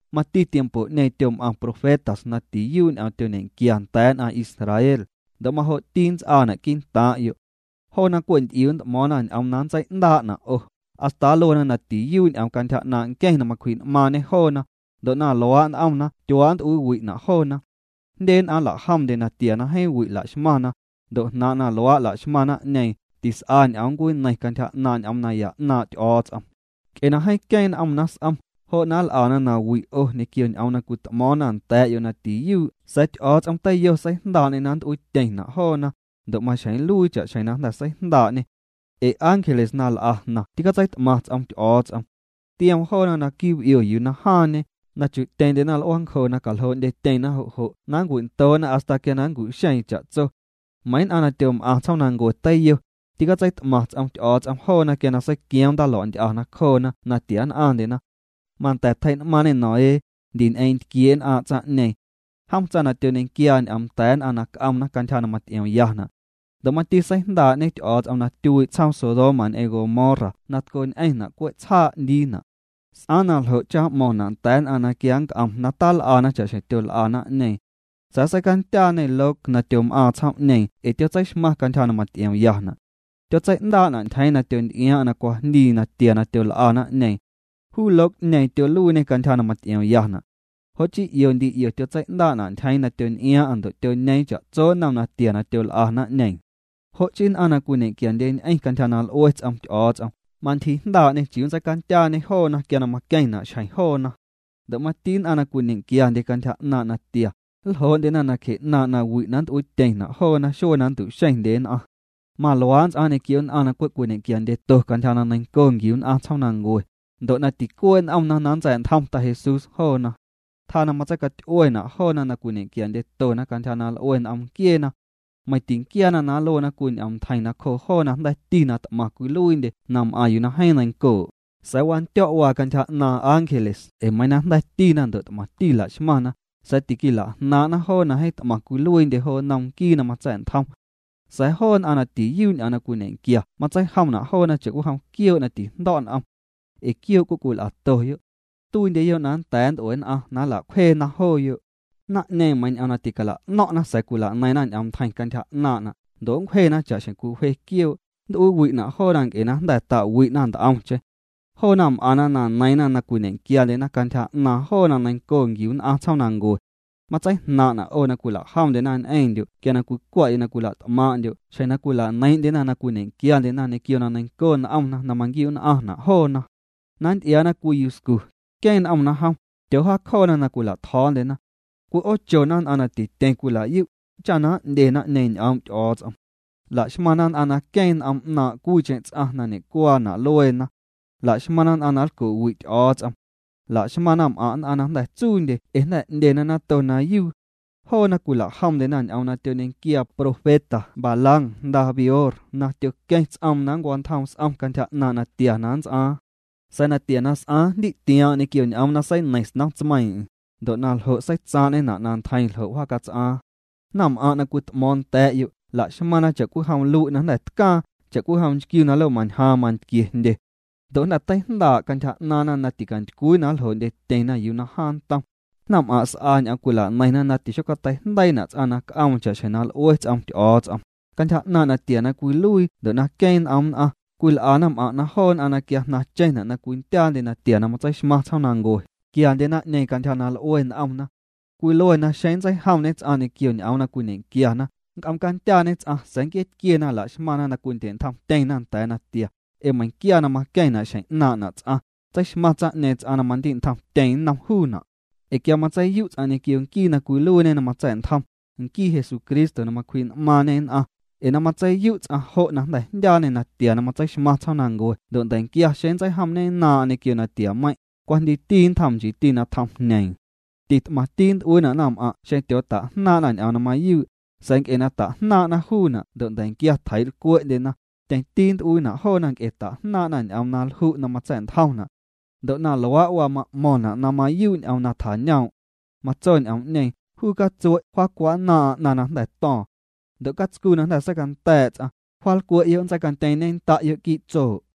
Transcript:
Mati tiempo'ñeeⁿ tyom'aⁿ profetas na tiyuu' ñ'oom tyoñequia nda̱a̱ nn'aⁿ Israel, ndo' majo'ti nnts'aana' quii'ntaaⁿ'yo'. Joona cwe' nty'iu nt'mo̱o̱ⁿna ñ'oom na nntsei'ndaa'na' 'o, hasta nluena na tiyuu' ñ'oom cantyja 'naaⁿ' nqueⁿ na macwji'n'maaⁿñê joona, ndo' na luaa' n'omna tyuaa' nnt'uiiwi'na' joona. Jndye nn'aⁿ nla'jomndye natia na jeeⁿ wi' laxmaⁿna, ndo' jnaaⁿ' na luaa' laxmaⁿ naⁿ'ñeeⁿ, tis'a ñ'oom ncwineiⁿ cantyja 'naaⁿ' ñ'oom naya 'naaⁿ' Ty'o̱o̱ts'om. Nc'e na jeeⁿ queeⁿ n'omna s'om, jo' na nl'ana nawi' 'o ñequio ñ'oom na cwit'mo̱o̱ⁿna nda̱a̱'yo' na tiyuu' sa̱a̱ Ty'o̱o̱ts'om teiyo seijndaa'ñê na nnt'uiityeⁿna' joona, ndo' maxjeⁿ nluii cha'xjeⁿ na jnda̱ seijndaa'ñê. Ee ángeles na l'a jnaⁿ tîcatseit'maⁿ ts'om Ty'o̱o̱ts'om. Tioom joona naquii' b'io yuu na jaaⁿñe, na chu'tyeⁿndyena l'uaancjo na caljoo'ndyetyeⁿna jo' jo' na nncwindoo'na hasta quia na nncu'xeeⁿ cha'tso. Meiⁿ nn'aⁿ na tyom'aⁿ tsjoomnancue teiyo, tîcatseit'maⁿ ts'om Ty'o̱o̱ts'om joona quia seiquioom ndaalua'nty'a nacjoona na tia nn'aⁿndyena. Manda̱ tjei'n'maaⁿñê Noé, ndi ñ'eeⁿ ntquiee' nn'aaⁿ' tsaⁿ'ñeeⁿ. Jom tsaⁿ na tyoñequiaa ñ'oom nda̱a̱ nn'aⁿ na c'omna cantyja na maty'iomyana'. Ndo' mati seijndaa'ñe Ty'o̱o̱ts'om na tyuii' tsjoom Sodoma ñ'eⁿ Gomorra na tco ñ'eⁿna' cwe' tsjaa' 'ndiina'. S'aaⁿ na ljo' cha na m'mo̱ⁿna' nda̱a̱ nn'aⁿ na quia nnc'om na tal'ana cha'xjeⁿ tyol'a naⁿ'ñeeⁿ. Sa̱a̱ seicandyaañê Lot na tyom'aaⁿ tsjoom'ñeeⁿ ee tyotseixmaⁿ cantyja na maty'iomyana'. Tyotsei'ndaa'na' ntyjeeⁿ na tyonty'iaaⁿ'aⁿ na cwajndii natia na tyol'a naⁿ'ñeeⁿ. Juu Lot'ñeeⁿ tyoluiiñê cantyja na maty'iomyana'. Jo' chii 'io ndi 'io tyotsei'ndaa'na' ntyjeeⁿ na tyonty'iaaⁿ'aⁿ ndo' tyoñeeⁿ cha'tso nnom natia na tyol'a naⁿ'ñeeⁿ. Jo' chii nn'aⁿ na cwiñequiandyeñ'eⁿ cantyja na l'ue ts'om Ty'o̱o̱ts'om, mantyjiijndaa'ñê chiuu nntseicandyaañê ts'aⁿ quia na maqueⁿna' xjeⁿ juu. Ndo' mati nn'aⁿ na cwiñequiandye cantyja 'naaⁿ' natia, nljoo'ndyena nacje 'naaⁿ' nawi' na nt'uiityeⁿna' joona xuee na nntu'xeⁿndye nn'aⁿ. Maluaa' nnts'aaⁿ ñequio nn'aⁿ na cwe' cwiñe'quiandyeto cantyja na neiⁿnco nquiu nn'aⁿ tsjoomnancue, ndo' na ticuee' n'omna na nntsa̱'ntjom Ta Jesús joona. Tjaa na matseicaty'uena' joona na cwiñe'quiandyetona cantyja na l'ue n'om nquieena. Meiⁿ tinquiaana na nluena cwii ñ'oomntjeiⁿ nacjoo joo na jnda̱ti na t'maⁿ cwiluiindye na m'aⁿ yuu na jeeⁿ neiⁿncoo', sa̱a̱ wandyo̱' waa cantyja 'naaⁿ ángeles ee meiiⁿ na jnda̱tina ndo' t'maⁿti laxmaⁿna, sa̱a̱ tiquila'jnaaⁿ'na joo na jeeⁿ t'maⁿ cwiluiindye jo nnom nquii na matsa̱'ntjom. Sa̱a̱ joo nn'aⁿ na tiyuu' ñ'oom na cwiñequia matseijomna' joona cha'cwijom quioo' na tijndo̱' n'om. Ee quioo' cwe' cwil'atoyo'. Tuiindyeyo' na nda̱a̱ nnt'ue nn'aⁿ na nla'cwjeena jooyo'. Naⁿ'ñeeⁿ meiiⁿ ñ'oom na ticala'no̱ⁿ'na sa̱a̱ cwilaneiⁿna ñ'oom ntjeiⁿ cantyja 'naaⁿna', ndo' nncwjena cha'xjeⁿ cwiwje quioo', nnt'uiiwi'na' joona nc'e na jnda̱ ta'wi'na nt'omcheⁿ. Joona m'aⁿna na neiiⁿna na cwiñequiandyena cantyja 'naaⁿ joo na neiⁿnco nquiu nn'aⁿ tsjoomnancue. Matseijnaaⁿ'na' 'o na cwilajomndyena ñ'eⁿndyo' quia cwicwa'yo' na cwila't'maaⁿ'ndyo' xjeⁿ na cwila'neiiⁿ'ndyena na cwiñequiandyena ñequio na neiⁿnco n'omna na manquiu'nn'aⁿna' joona. Na nty'iaana cwii yuscu, queeⁿ n'omna jom, tyoojaacjoona na cwila'tjo̱o̱ndyena. Nn'aⁿ na tityeⁿ cwila'yu', cwi'oochoondyena naⁿ'ñeeⁿ na n'ndye ñ'oom' Ty'o̱o̱ts'om. Laxmaⁿna nn'aⁿ na queeⁿ n'om 'naaⁿ' cwiicheⁿ ts'aⁿ na ñe'cuaana' lueena. Laxmaⁿna nn'aⁿ na nlco'wi' Ty'o̱o̱ts'om. La'xmaⁿ naⁿm'aⁿ' nn'aⁿ na jnda̱ tsuundye ee jnda̱ 'ndyena nato na yuu. Joona cwila'jomndyena ñ'oom na tyoñequiaa profeta Balaam jnda Beor na tyoqueⁿ ts'oom na nncwantjoom s'om cantyja 'naaⁿ' natia na nnts'aaⁿ. Sa̱a̱ na tia na s'aaⁿ, jndi'tiaaⁿ'aⁿ ñ'oom 'ndyoo ts'aⁿ na seineiⁿ snom tsmeiiⁿ'eⁿ, ndo' na ljo' seitsaaⁿ'ñena' na ntjeiⁿ ljo' wjacats'aaⁿ. Naⁿm'aⁿ' na cwit'mo̱o̱ⁿ nda̱a̱'yo', la'xmaⁿna cha'cwijom lui' na jnda̱ tcaaⁿ, cha'cwijom nchquiu na lomañjaaⁿ mantquie jndye. Ndo' jnda̱ teijndaa' cantyja 'naaⁿna na ticantycwii na ljoo'ndyetyeⁿna yuu na jaaⁿ ntom. Naⁿm'aⁿ' s'a ñ'oom cwilaneiⁿna na tixocateijndeiina' ts'aⁿ na c'oom cha'xjeⁿ na l'ue ts'om Ty'o̱o̱ts'om, cantyja 'naaⁿ' natia na cwiluii ndo' na queeⁿ n'om nn'aⁿ, cwil'a naⁿm'aⁿ' na joo nn'aⁿ na quia jnaⁿcheⁿna' na cwindyaandye natia na matseixmaⁿ tsjoomnancue, quiandye naⁿ'ñeeⁿ cantyja na l'ue n'omna. Cwiluena xeⁿ nntseijomñe ts'aⁿ ñequio ñ'oom na cwiñequiana, nnc'oom candyaañe ts'aⁿ sa̱a̱ nquiee tquiena laxmaⁿna na cwindye'ntjomtyeⁿna nda̱a̱ natia, ee meiⁿquia na maqueⁿna' xjeⁿ 'naaⁿ'na' ts'aⁿ, tseixmaⁿ tsaⁿ'ñeeⁿ ts'aⁿ na mandi'ntjomtyeⁿ nnom juuna'. Ee quia matseiyu' ts'aⁿ ñequio nquii na cwiluiiñe na matsa̱'ntjom, nquii Jesucristo na macwji'n'maaⁿñe nn'aⁿ, ee na matseiyu' ts'aⁿ jo' jnda̱ jndyaañê natia na matseixmaⁿ tsjoomnancue ndo' nda̱quia xeⁿ nntseijomñennaaⁿ'aⁿ ñequio natiameiⁿ', cwajndiiti nntjoom, nchiiti na tjom jñeeⁿ. Tit'maⁿti nnt'uiina' naⁿm'aⁿ' xeⁿ tyootajnaaⁿ'na ñ'oom na mayuu', sa̱a̱ nc'e na ta'jnaaⁿ'na juuna' ndo' nda̱quia tjeii'lcwe'ndyena, tyeⁿti nt'uiina' joona nc'e ta'jnaaⁿ'na ñ'oom na lju' na matsa̱'ntjomna'. Ndo' na luaa' waa ma'mo̱ⁿna' na mayuu' ñ'oom na tjañoom'. Matso ñ'oom'ñeeⁿ: “Juu catsue' wjaacwa'nnaaⁿ'aⁿ 'naⁿ na jnda̱ to̱o̱ⁿ. Ndo' catscu na jnda̱ seicanda̱a̱' ts'aⁿ, wjaalcwe'yo', nntseicantyeeⁿñennda'yo' quii' tsoo'.”